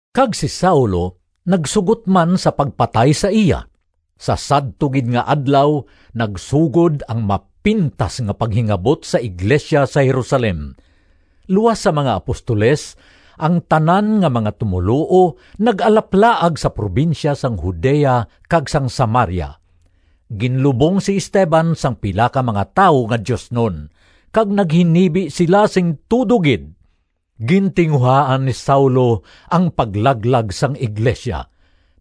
Kag si Saulo nagsugot man sa pagpatay sa iya. Sa sadto gid nga adlaw, nagsugod ang mapintas nga paghingabot sa iglesia sa Jerusalem. Luas sa mga apostoles, ang tanan nga mga tumoluo nag-alaplaag sa probinsya sang Judea kag sang Samaria. Ginlubong si Esteban sang pila ka mga tawo nga diosnon kag naghinibi sila sing tudo gid. Gintinguhaan ni Saulo ang paglaglag sang iglesia.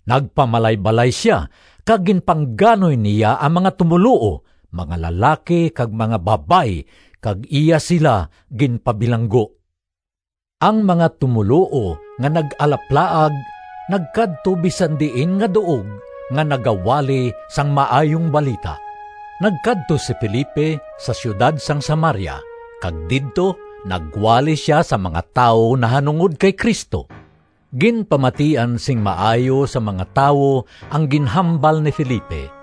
Nagpamalaybalay sia kag ginpangganoy niya ang mga tumoluo, mga lalaki kag mga babayi kag iya sila ginpabilanggo. Ang mga tumoluo nga nag-alaplaag nagkadto bisan diin nga duog nga nagawali sang Maayong Balita. Nagkadto si Felipe sa siyudad sang Samaria kag didto nagwali sia sa mga tawo nahanungod kay Cristo. Ginpamatian sing maayo sang mga tawo ang ginhambal ni Felipe.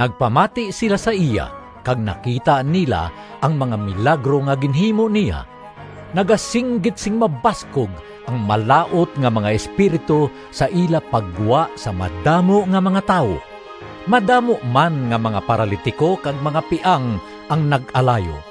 Nagpamati sila sa iya kag nakita nila ang mga milagro nga ginhimo niya. Nagasinggit sing mabaskog ang malaut nga mga espiritu sa ila paggwa sa madamo nga mga tawo. Madamo man nga mga paralitiko kag mga piang ang nag-alayo.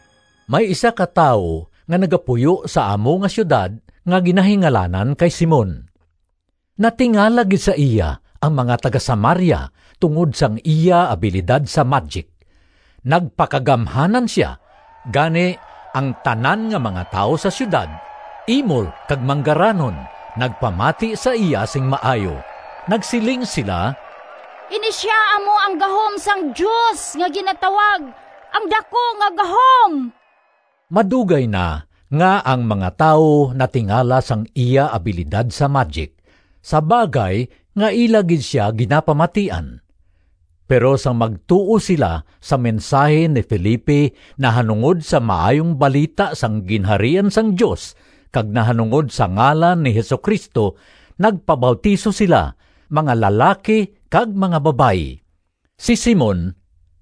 May isa ka tawo nga nagapuyo sa amo nga siyudad nga ginahingalanan kay Simon. Natingala gid sa iya ang mga taga-Samaria tungod sang iya abilidad sa madyik. Nagpakagamhanan sia, gani ang tanan nga mga tawo sa siyudad, imol kag manggaranon, nagpamati sa iya sing maayo. Nagsiling sila, “Ini sia amo ang gahom sang Dios nga ginatawag ‘Ang Daku nga Gahom.’” Madugay na nga ang mga tawo natingala sang iya abilidad sa madyik, sa bagay nga ila gid sia ginapamatian. Pero sang magtuo sila sa mensahi ni Felipe nahanungod sa Maayong Balita sang Ginharian sang Dios kag nahanungod sa ngalan ni Jesu-Cristo, nagpabautiso sila, mga lalaki kag mga babayi. Si Simon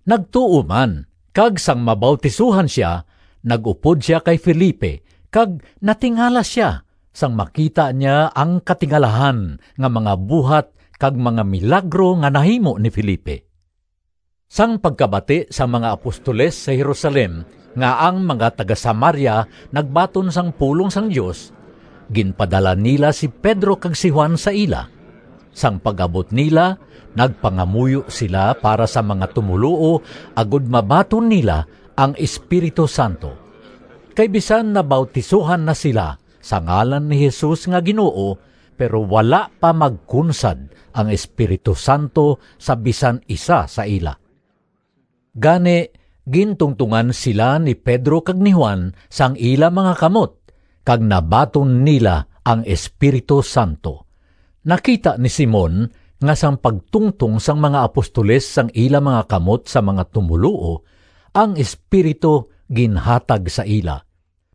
nagtuo man kag sang mabautisohan sia nag-upod sia kay Felipe kag natingala sia sang makita niya ang katingalahan nga mga buhat kag mga milagro nga nahimo ni Felipe. Sang pagkabati sang mga apostoles sa Jerusalem nga ang mga taga-Samaria nagbaton sang pulong sang Dios, ginpadala nila si Pedro kag si Juan sa ila. Sang pag-abot nila nagpangamuyo sila para sa mga tumoluo agod mabaton nila ang Espiritu Santo. Kay bisan nabautisohan na sila sa ngalan ni Jesus nga Ginoo, pero wala pa magkunsad ang Espiritu Santo sa bisan isa sa ila. Gani gintungtongan sila ni Pedro kag ni Juan sang ila mga kamot, kag nabaton nila ang Espiritu Santo. Nakita ni Simon nga sang pagtungtong sang mga apostoles sang ila mga kamot sa mga tumoluo, ang Espiritu ginhatag sa ila.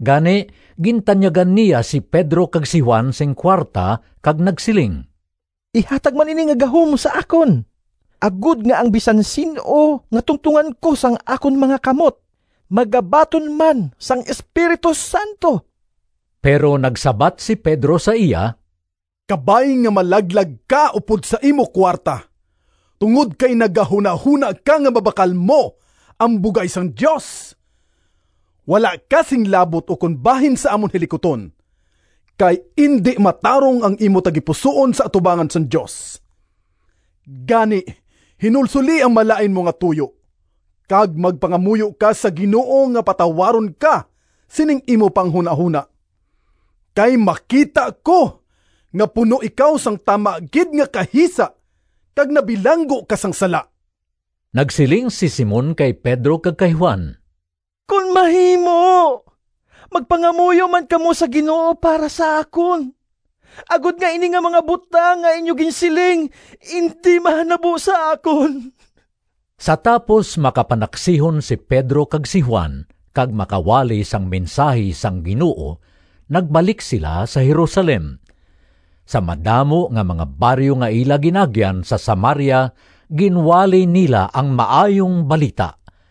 Gani gintanyagan niya si Pedro kag si Juan sing kuwarta kag nagsiling, “Ihatag man ini nga gahom sa akon, agod nga ang bisan sin-o nga tungtongan ko sang akon mga kamot magabaton man sang Espiritu Santo.” Pero nagsabat si Pedro sa iya, “Kabay nga malaglag ka upod sa imo kuwarta, tungod kay nagahunahona ka nga mabakal mo ang bugay sang Dios! Wala ka sing labot ukon bahin sa amon hilikuton, kay indi matarong ang imo tagipusoon sa atubangan sang Dios. Gani, hinulsoli ang malain mo nga tuyo, kag magpangamuyo ka sa Ginoo nga patawaron ka sining imo panghunahona. Kay makita ko nga puno ikaw sang tama gid nga kahisa kag nabilanggo ka sang sala.” Nagsiling si Simon kay Pedro kag kay Juan, “Kon mahimo magpangamuyo man kamo sa Ginoo para sa akon, agod nga ini nga mga butang nga inyo ginsiling indi mahanabo sa akon.” Sa tapos makapanaksihon si Pedro kag si Juan kag makawali sang mensahi sang Ginoo, nagbalik sila sa Jerusalem. Sa madamo nga mga baryo nga ila gin-agyan sa Samaria ginwali nila ang Maayong Balita.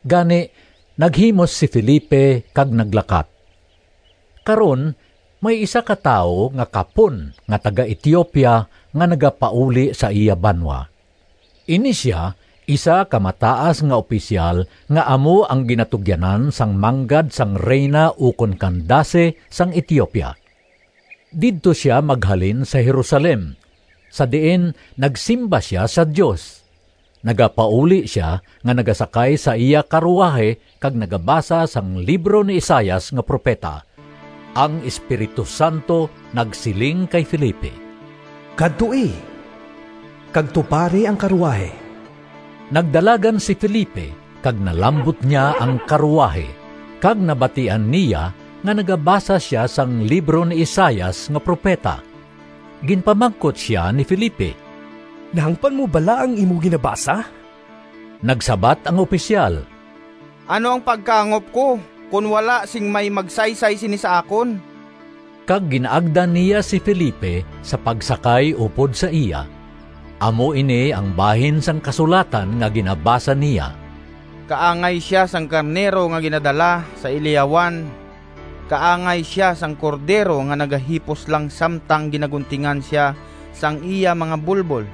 Gani naghimos si Felipe kag naglakat. Karon may isa ka tawo nga kapon nga taga-Etiopia nga nagapauli sa iya banwa. Ini sia isa ka mataas nga opisyal nga amo ang ginatugyanan sang manggad sang Rayna ukon Candace sang Etiopia. Didto sia maghalin sa Jerusalem sa diin nagsimba sia sa Dios. Nagapauli sia nga nagasakay sa iya karuwahi kag nagabasa sang libro ni Isaias nga propeta. Ang Espiritu Santo nagsiling kay Felipe, “Kadtoi kag tupari ang karuwahi.” Nagdalagan si Felipe kag nalambot niya ang karuwahi, kag nabatian niya nga nagabasa sia sang libro ni Isaias nga propeta. Ginpamangkot sia ni Felipe, “Nahangpan mo bala ang imo ginabasa?” Nagsabat ang opisyal, “Ano ang pagkahangop ko kon wala sing may magsaysay sini sa akon?” Kag gin-agda niya si Felipe sa pagsakay upod sa iya. Amo ini ang bahin sang kasulatan nga ginabasa niya: “Kaangay sia sang karnero Nga ginadala sa ilihawan, Kaangay sia sang cordero Nga nagahipos lang Samtang ginaguntingan sia Sang iya mga bulbol.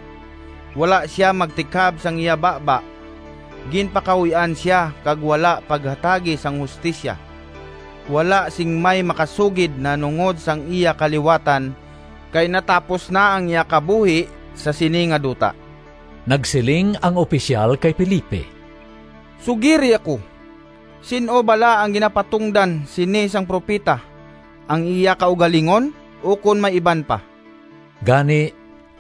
Wala sia magtikab sang iya baba. Ginpakahuy-an sia Kag wala paghatagi sing hustisya. Wala sing may makasugid Nahanungod sang iya kaliwatan, Kay natapos na ang iya kabuhi Sa sini nga duta.” Nagsiling ang opisyal kay Felipe, “Sugiri ako, sin-o bala ang ginapatungdan sini sang propeta? Ang iya kaugalingon ukon may iban pa?” Gani,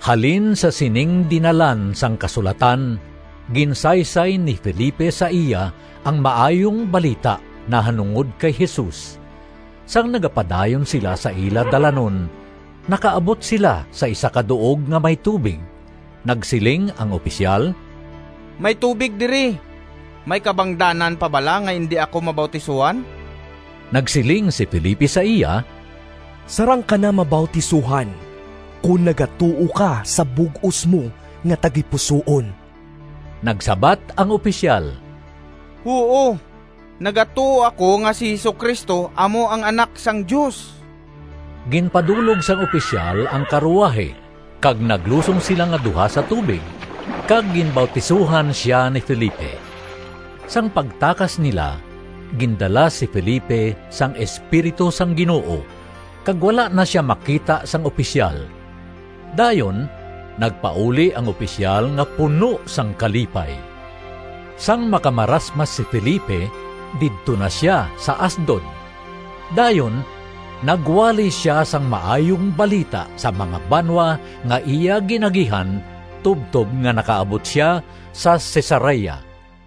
halin sa sining dinalan sang kasulatan, ginsaysay ni Felipe sa iya ang Maayong Balita nahanungod kay Jesus. Sang nagapadayon sila sa ila dalanon, nakaabot sila sa isa ka duog nga may tubig. Nagsiling ang opisyal, “May tubig diri. May kabangdanan pa bala nga indi ako mabautisohan?” [ Nagsiling si Felipe sa iya, “Sarang ka na mabautisohan kon nagatuo ka sa bug-os mo nga tagipusoon.” Nagsabat ang opisyal, “Huo, nagatuo ako nga si Jesu-Cristo amo ang Anak sang Dios.”] Ginpadulog sang opisyal ang karuwahi kag naglusong sila nga duha sa tubig kag ginbautisohan sia ni Felipe. Sang pagtakas nila gindala si Felipe sang Espiritu sang Ginoo, kag wala na sia makita sang opisyal. Dayon nagpauli ang opisyal nga puno sang kalipay. Sang makamarasmas si Felipe didto na sia sa Asdod. Dayon nagwali sia sang Maayong Balita sa mga banwa nga iya gin-agihan tubtob nga nakaabot sia sa Cesarea.